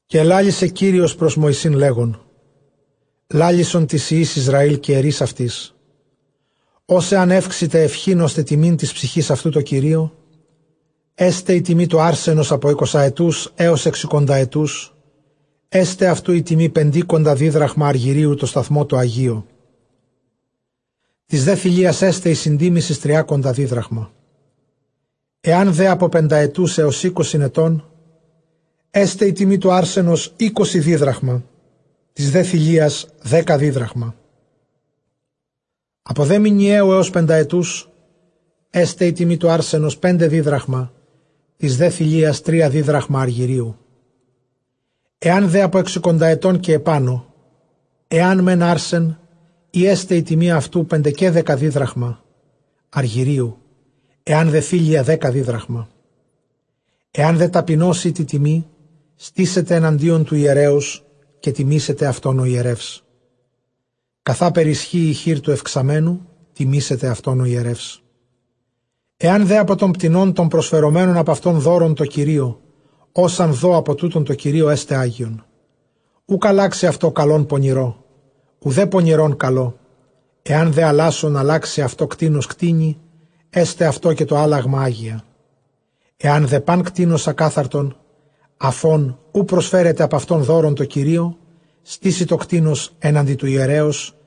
Καὶ ἐλάλησε Κύριος πρὸς Μωυσῆν, λέγων, λάλησον τοῖς υἱοῖς Ἰσραὴλ, καὶ ἐρεῖς αὐτοῖς, ὃς ἂν εὔξηται εὐχὴν ὥστε τιμὴν τῆς ψυχῆς αὐτοῦ τῷ Κυρίῳ, ἔσται ἡ τιμὴ τοῦ ἄρσενος ἀπὸ εἰκοσαετοῦς, ἕως ἑξηκονταετοῦς, ἔσται αὐτοῦ ἡ τιμὴ πεντήκοντα δίδραχμα ἀργυρίου τῷ σταθμῷ τῷ ἁγίῳ· Τῆς δὲ θηλείας ἔσται ἡ συντίμησις τριάκοντα δίδραχμα. Ἐὰν δὲ ἀπὸ πενταετοῦς ἕως εἴκοσι ἐτῶν, ἔσται ἡ τιμὴ τοῦ ἄρσενος εἴκοσι δίδραχμα· τῆς δὲ θηλείας, δέκα δίδραχμα. Ἀπὸ δὲ μηνιαίου ἕως πενταετοῦς, ἔσται ἡ τιμὴ τοῦ ἄρσενος πέντε δίδραχμα· τῆς δὲ θηλείας, τρία δίδραχμα ἀργυρίου. Ἐὰν δὲ ἀπὸ ἑξήκοντα ἐτῶν καὶ ἐπάνω, ἐὰν μὲν ἄρσεν ᾖ, ἔσται ἡ τιμὴ αὐτοῦ πεντεκαίδεκα δίδραχμα ἀργυρίου· ἐὰν δὲ θήλεια, δέκα δίδραχμα. Ἐὰν δὲ ταπεινὸς ᾖ τῇ τιμῇ, στήσεται ἐναντίον τοῦ ἱερέως· καὶ τιμήσεται αὐτὸν ὁ ἱερεύς· καθάπερ ἰσχύει ἡ χεὶρ τοῦ εὐξαμένου, τιμήσεται αὐτὸν ὁ ἱερεύς. Ἐὰν δὲ ἀπὸ τῶν κτηνῶν τῶν προσφερομένων ἀπʼ αὐτῶν δῶρον τῷ Κυρίῳ, ὃς ἂν δῷ ἀπὸ τούτων τῷ Κυρίῳ, ἔσται ἅγιον. Οὐκ ἀλλάξει αὐτὸ καλὸν πονηρῷ, οὐδὲ πονηρὸν καλῷ· ἐὰν δὲ ἀλλάσσων ἀλλάξῃ αὐτὸ κτῆνος κτήνει, ἔσται αὐτὸ καὶ τὸ ἄλλαγμα ἅγια. Ἐὰν δὲ πᾶν κτῆνος ἀκάθαρτον, ἀφʼ ὧν οὐ προσφέρεται ἀπʼ αὐτῶν δῶρον τῷ Κυρίῳ, στήσει τὸ κτῆνος ἔναντι τοῦ ἱερέως,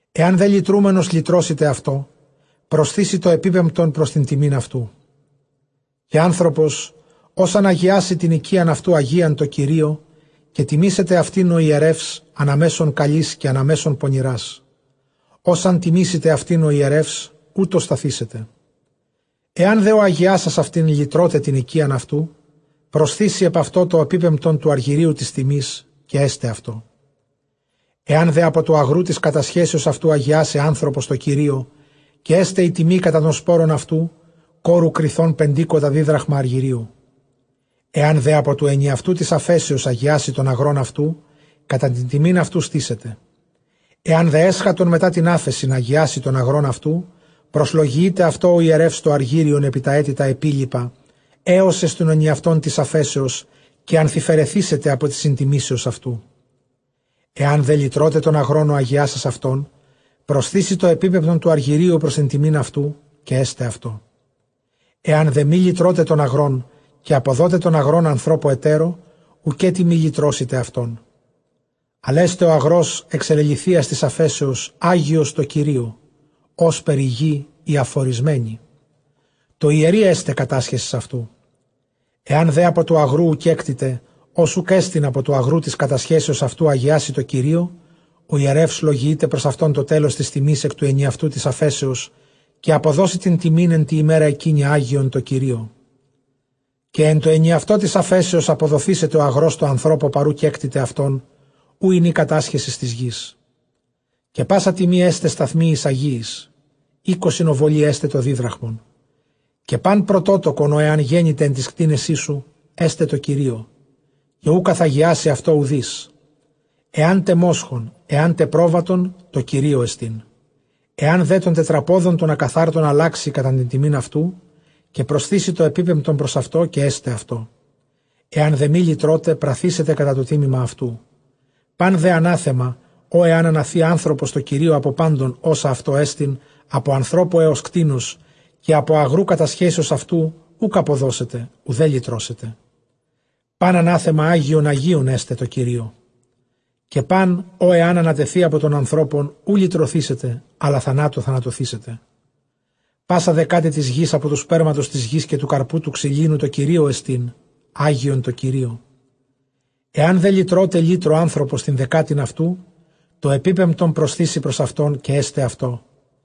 Ἐὰν δὲ λυτρούμενος λυτρώσηται αὐτὸ, προσθήσει τὸ ἐπίπεμπτον πρὸς τὴν τιμὴν αὐτοῦ. Καὶ ἄνθρωπος ὃς ἂν ἁγιάσῃ τὴν οἰκίαν αὐτοῦ ἁγίαν τῷ Κυρίῳ, καὶ τιμήσεται αὐτὴν ὁ ἱερεὺς ἀναμέσον καλῆς καὶ ἀναμέσον πονηρᾶς· ὡς ἂν τιμήσηται αὐτὴν ὁ ἱερεὺς, οὕτω σταθήσεται. Ἐὰν δὲ ὁ ἁγιάσας αὐτὴν λυτρῶται τὴν οἰκίαν αὐτοῦ, προσθήσει ἐπʼ αὐτὸ τὸ ἐπίπεμπτον τοῦ ἀργυρίου τῆς τιμῆς, καὶ ἔσται αὐτῷ. Ἐὰν δὲ ἀπὸ τοῦ ἀγροῦ τῆς κατασχέσεως αὐτοῦ ἁγιάσῃ ἄνθρωπος τῷ Κυρίῳ, καὶ ἔσται ἡ τιμὴ κατὰ τὸν σπόρον αὐτοῦ, κόρου κριθῶν πεντήκοντα δίδραχμα ἀργυρίου. Ἐὰν δὲ ἀπὸ τοῦ ἐνιαυτοῦ τῆς ἀφέσεως ἁγιάσῃ τὸν ἀγρὸν αὐτοῦ, κατὰ τὴν τιμὴν αὐτοῦ στήσεται. Ἐὰν δὲ ἔσχατον μετὰ τὴν ἄφεσιν ἁγιάσῃ τὸν ἀγρὸν αὐτοῦ, προσλογιεῖται αὐτῷ ὁ ἱερεὺς τὸ ἀργύριον ἐπὶ τὰ ἔτη τὰ ἐπίλοιπα, ἕως εἰς τὸν ἐνιαυτὸν τῆς ἀφέσεως, καὶ ἀνθυφαιρεθήσεται ἀπὸ τῆς συντιμήσεως αὐτοῦ. Ἐὰν δὲ λυτρῶται τὸν ἀγρὸν ὁ ἁγιάσας αὐτὸν, προσθήσει τὸ ἐπίπεμπτον τοῦ ἀργυρίου πρὸς τὴν τιμὴν αὐτοῦ, καὶ ἔσται αὐτῷ. Ἐὰν δὲ μὴ λυτρῶται τὸν ἀγρὸν, καὶ ἀποδῶται τὸν ἀγρὸν ἀνθρώπῳ ἑτέρῳ, οὐκέτι μὴ λυτρώσηται αὐτόν. Ἀλλʼ ἔσται ὁ ἀγρὸς ἐξεληλυθυίας τῆς ἀφέσεως ἅγιος τῷ Κυρίῳ, ὥσπερ ἡ γῆ ἡ ἀφωρισμένη τῷ ἱερεῖ ἔσται κατάσχεσις αὐτοῦ. Ἐὰν δὲ ἀπὸ τοῦ ἀγροῦ οὗ κέκτηται, ὃς οὐκ ἔστιν ἀπὸ τοῦ ἀγροῦ τῆς κατασχέσεως αὐτοῦ, ἁγιάσῃ τῷ Κυρίῳ, λογιεῖται πρὸς αὐτὸν ὁ ἱερεὺς τὸ τέλος τῆς τιμῆς ἐκ τοῦ ἐνιαυτοῦ τῆς ἀφέσεως, καὶ ἀποδώσει τὴν τιμὴν ἐν τῇ ἡμέρᾳ ἐκείνῃ ἁγίαν τῷ Κυρίῳ· Καὶ ἐν τῷ ἐνιαυτῷ τῆς ἀφέσεως ἀποδοθήσεται ὁ ἀγρὸς τῷ ἀνθρώπῳ παρʼ οὗ κέκτηται αὐτὸν, οὗ ἦν ἡ κατάσχεσις τῆς γῆς. Καὶ πᾶσα τιμὴ ἔσται σταθμίοις ἁγίοις· εἴκοσι ὀβολοὶ ἔσται τὸ δίδραχμον. Καὶ πᾶν πρωτότοκον ὃ ἐὰν γένηται ἐν τοῖς κτήνεσί σου, ἔσται τῷ Κυρίῳ, καὶ οὐ καθαγιάσει αὐτὸ οὐδείς· ἐάν τε μόσχον, ἐάν τε πρόβατον, τῷ Κυρίῳ ἐστίν. Ἐὰν δὲ τῶν τετραπόδων τῶν ἀκαθάρτων ἀλλάξῃ κατὰ τὴν τιμὴν αὐτοῦ, καὶ προσθήσει τὸ ἐπίπεμπτον πρὸς αὐτὸ, καὶ ἔσται αὐτῷ· ἐὰν δὲ μὴ λυτρῶται, πραθήσεται κατὰ τὸ τίμημα αὐτοῦ. Πᾶν δὲ ἀνάθεμα, ὃ ἂν ἀναθῇ ἄνθρωπος τῷ Κυρίῳ ἀπὸ πάντων, ὅσα αὐτῷ ἐστιν, ἀπὸ ἀνθρώπου ἕως κτήνους, καὶ ἀπὸ ἀγροῦ κατασχέσεως αὐτοῦ, οὐκ ἀποδώσεται οὐδὲ λυτρώσεται· πᾶν ἀνάθεμα ἅγιον ἁγίων ἔσται τῷ Κυρίῳ. Καὶ πᾶν ὃ ἐὰν ἀνατεθῇ ἀπὸ τῶν ἀνθρώπων, οὐ λυτρωθήσεται, ἀλλὰ θανάτῳ θανατωθήσεται. Πᾶσα δεκάτη τῆς γῆς, ἀπὸ τοῦ σπέρματος τῆς γῆς, καὶ τοῦ καρποῦ τοῦ ξυλίνου, τῷ. Κυρίῳ ἐστίν, ἅγιον τῷ Κυρίῳ. Ἐὰν δὲ λυτρῶται λύτρῳ ἄνθρωπος τὴν δεκάτην αὐτοῦ, τὸ ἐπίπεμπτον προσθήσει πρὸς αὐτὸν, καὶ ἔσται αὐτῷ.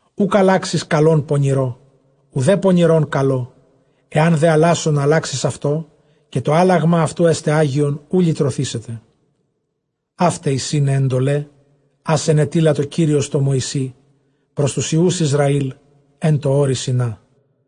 Οὐκ ἀλλάξεις καλὸν πονηρῷ, οὐδὲ πονηρὸν καλῷ· ἐὰν δὲ ἀλλάσσων ἀλλάξῃς αὐτό, καὶ τὸ ἄλλαγμα αὐτοῦ ἔσται ἅγιον, οὐ λυτρωθήσεται. Αὗταί εἰσιν αἱ ἐντολαὶ ἃς ἐνετείλατο Κύριος τῷ Μωυσῇ πρὸς τοὺς υἱοὺς Ἰσραὴλ ἐν τῷ ὄρει Σινᾷ.